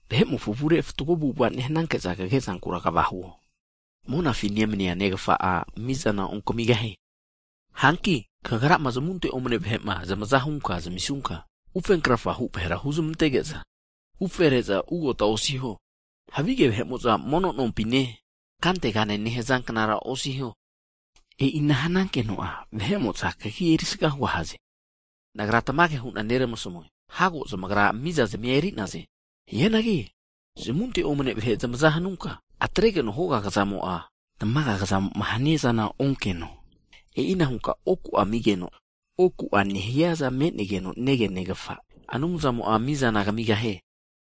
Vahe'mofo avure fatgo avu'ava nehanage'za kagezankura kva hiho, monafi mani'nea Neramafa'a mizana ontamigahie. Hanki kagrama zamunte omane vahe'ma zamaza hunka keonke'zama zamisunka, ufenkrafahu vahera huzmantege'za ufre'za ugota osiho, havige vahe'mo'za mono nompine (sinagog) kantegane nehaza knara osuo, e'ina hanankeno'a vahe'mo'za kagi erisaga hugahaze. Nagra tamage hu'na nermasmue, hago zamagra mizazmi'a eri'naze. Hianagi zamunte omane vahe zamaza hanunka, atregeno hoga kazamo'a, tamaga kazamo'ma hania zana onkeno, e'ina hunka oku'a amigeno, oku'a me'negeno negea Negafa Anumzamo'a mizana kamigahie.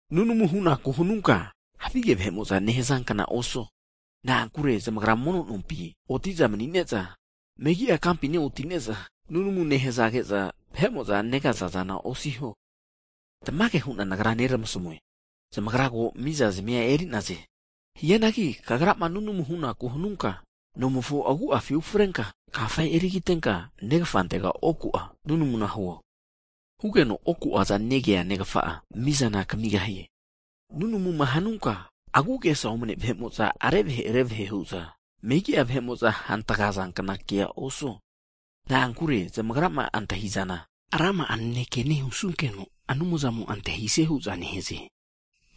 Nunamuma hunaku'ma hanuta, havige vahe'mo'za nehazankna osiho. Na'ankure zamagra mono nompi oti'za mani'ne'za, megi'a kampine oti'ne'za nunamu nehazage'za, vahe'mo'za negazazana osiho. Tamage hu'na Nagra neramasmue, zamagra ko mizazimia eri'naze. Hianagi tamagrama nunamu hunaku hanuta, nomofo agu'afi ufreta, kafa eri kiteta Neramafantega oku'a nunamu hiho. Hinkeno oku'aza negea Neramafa'a mizana tamigahie. Nunamuma hanuta, agu'agesa omne vahe'mo'za revahe revahe hu'za, megi'a vahe'mo'za (gentiles) hantgazankna kea osiho, na'ankure zamagrama antahi'zana, rama'a naneke nehusunkeno Anumzamo'a antahisie hu'za nehaze.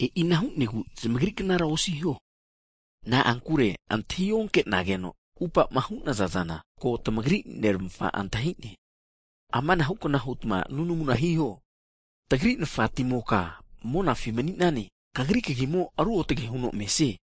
E'i ana hu'negu zamagri knara osiho. Na'ankure antahi onkenageno atupa'ma hu'naza zana ko tamagri Neramafa'a antahi'ne. Amanahu kna hutma nunamuna hiho. Tagri Nafati'moka monafi mani'nane, Kagri Kagimo ruotage huno mesie.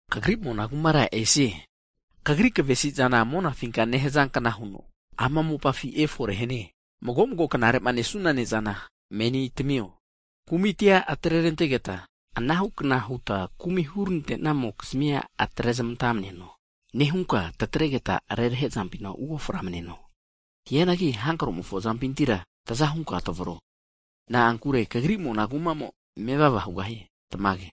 Kagri mona kumara esie, Kagri kavesi'zana monafinka nehazankna huno, ama mopafi efore hanie. Mago mago knare'ma nesuna ne'zana menina tamio. Kumitia atre'rantegeta, anahu kna huta kumi'ma hurante'namokizmi'a atre'zmanta maneno. Ana nehunka tatregeta rerahe'zampina uoframaneno. Hianagi hankromofo azampintira taza hunka tavro. [Na'ankure Kagri mona kumamo mevava hugahie. Tamage.]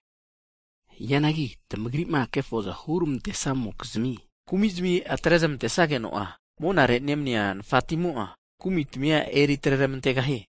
Hagi tamagrima kefoza hurmantesamokizmi kumi'zami atrezmante sageno'a, monare nemania Nafatimo'a, kumi'tamia eri atre ramantegahie.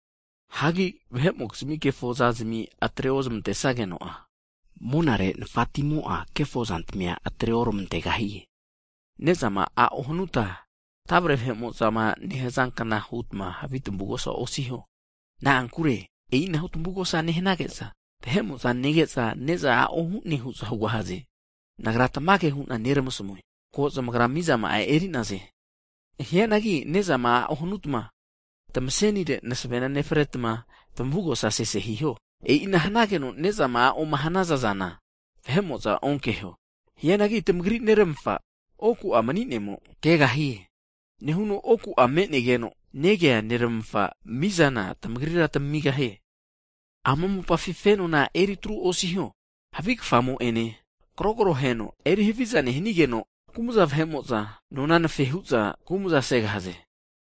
Hagi vahe'mokizmi kefozazimi atre ozmante snageno'a, monare nafatmimo'a, kefo zantamia atre oramantegahie. Ne'zama a'o hanuta tavre vahe'mo'za nehaza knara hutma havi tamugosa osiho. Na'ankure e'inahu tamugosa nehanage'za, vahe'mo'za nege'za, ne'za a'o hu'naze hu'za hugahaze. Nagra tamage hu'na neramasmue, ko zamagra mizama'a eri'naze. Hianagi ne'zama a'o hanutma, tamasenire masavena nefretma, tamugosa sese hiho. E'ina hanageno nezama a'oma hanaza zana vahe'mo'za onkeho. Hianagi tamagri Neramafa oku'a nemanimo kagegahie. Nehuno oku'a me'negeno negea Neramafa'a mizana tamagrira tamigahie. Ama mopafina knare'nare fenona eritru osiho, havi kafamo'ene, krogroheno erihaviza nehanigeno, kumza vahe'mo'za nona anafe hu'za kumza nesaze.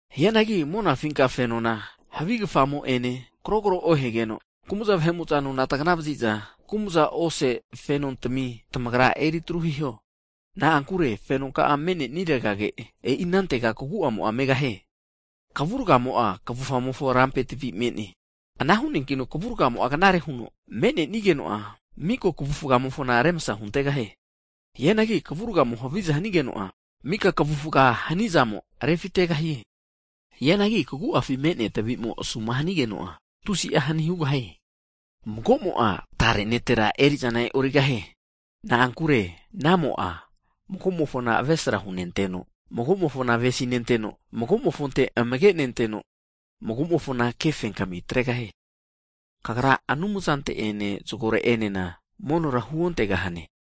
Hianagi monafinka fenona havi kafamo'ene, krogro ohegeno, kumza vahe'mo'za nona tagana vaziza kumza ose fenotamina, tamagra eritru hiho. Na'ankure fenonka'a me'nenirega, e'i anantega kagu'amo'a megahie. Kavurgamo'a kavufa'mofo rampe tavi me'ne, ana hu'neankino kavurgamo knare huno me'nenigeno'a, mika kavufamofona remsa hugantegahie. Hianagi kavurgamo'ma haviza hanigeno'a, mika kavufa hanizamo refitegahie. Hianagi kagu'afi me'nea tavimo asu'ma hanigeno'a, tusi'a hani hugahie. Mago'mo'a tare kva netrentera eri'zana e'origahie. Na'ankure anamo'a mago'mofona avesra hunenteno, mago'mofona avesi nenteno, mago'mofonte amage nenteno, mago'mofona kefenkami atregahie. Kagra Anumzante'ene zagore'enena erizana eri otegahane.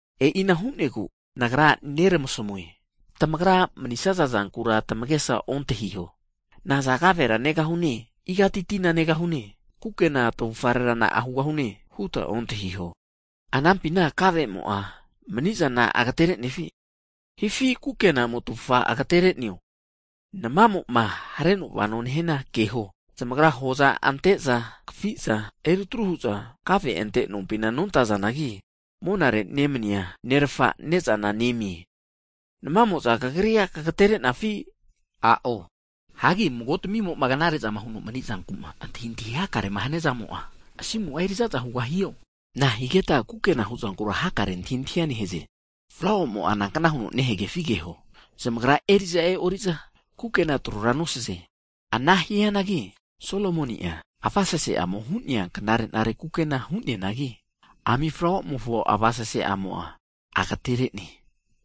E'ina hu'negu, Nagra neramasmue, tamagrama manisnaza zankura tamagesa antahintahi hakare osuta, naza kavera negahune, igati tina negahune, kukena tavufarera na'a hugahune huta ontahiho. Anampina kavemo'a mani'zana agaterenefi, hipi kukenamo'a tavufa agatere'neo? Namamo'ma hareno vano nehiana keho, zamagra hoza ante'za, kafiza, eri atru hu'za, kave ante'nompina nontazanagi, monare nemania Neramafa ne'zana nezamie. Namamo'za tamagrira tamagaterenafi? A'o. Hagi mago tamimo'ma knare'zama huno mani'zanku'ma antahintahi hakarema hania zamo'a, asimu'a erizazara hugahio? A'o. Nahigetma kukena huzankura hakare antahintahia nehaze? Flauamo'a nankna huno nehagefi keho, zamagra eri'za e'oriza kukena trora nosaze. Ana hianagi Solomoni'a avasese'amo hu'nea knare nare kukena hu'neanagi, ami flauamofo avasese'amo'a agatere'ne.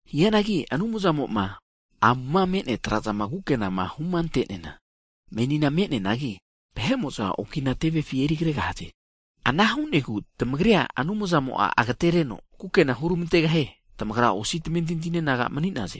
Hianagi Anumzamo'ma, amuma me'nea trazama kukenama huma ante'neana, menina me'neanagi vahe'mo'za okina tevefi eri kregahaze. Ana hu'negu tamagrira Anumzamo'a agatereno kukena hurmantegahie. Tamagra osi'a tamentinti'ne naga mani'naze.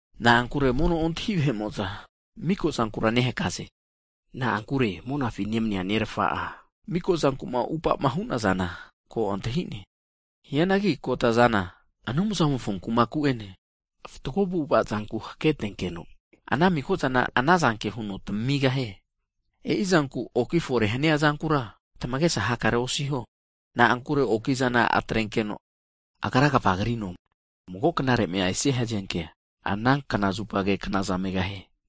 Na'ankure mono ontahi vahe'mo'za, miko zankura nehakaze. Na'ankure monafi nemania Neramafa'a miko zankuma upama hu'nazana ko antahi'ne. Hianagi kota zana, Anumzamofo kumaku'ene, fatgo avu'avazanku haketenkeno, ana maka'zana anazanke huno tamamigahie. E'i zanku oki fore hania zankura tamagesa hakare osiho. Na'ankure okizana atrenkeno, agra'a kva krino, mago knare'ma esia hazenkea, ana knazupage knaza megahie.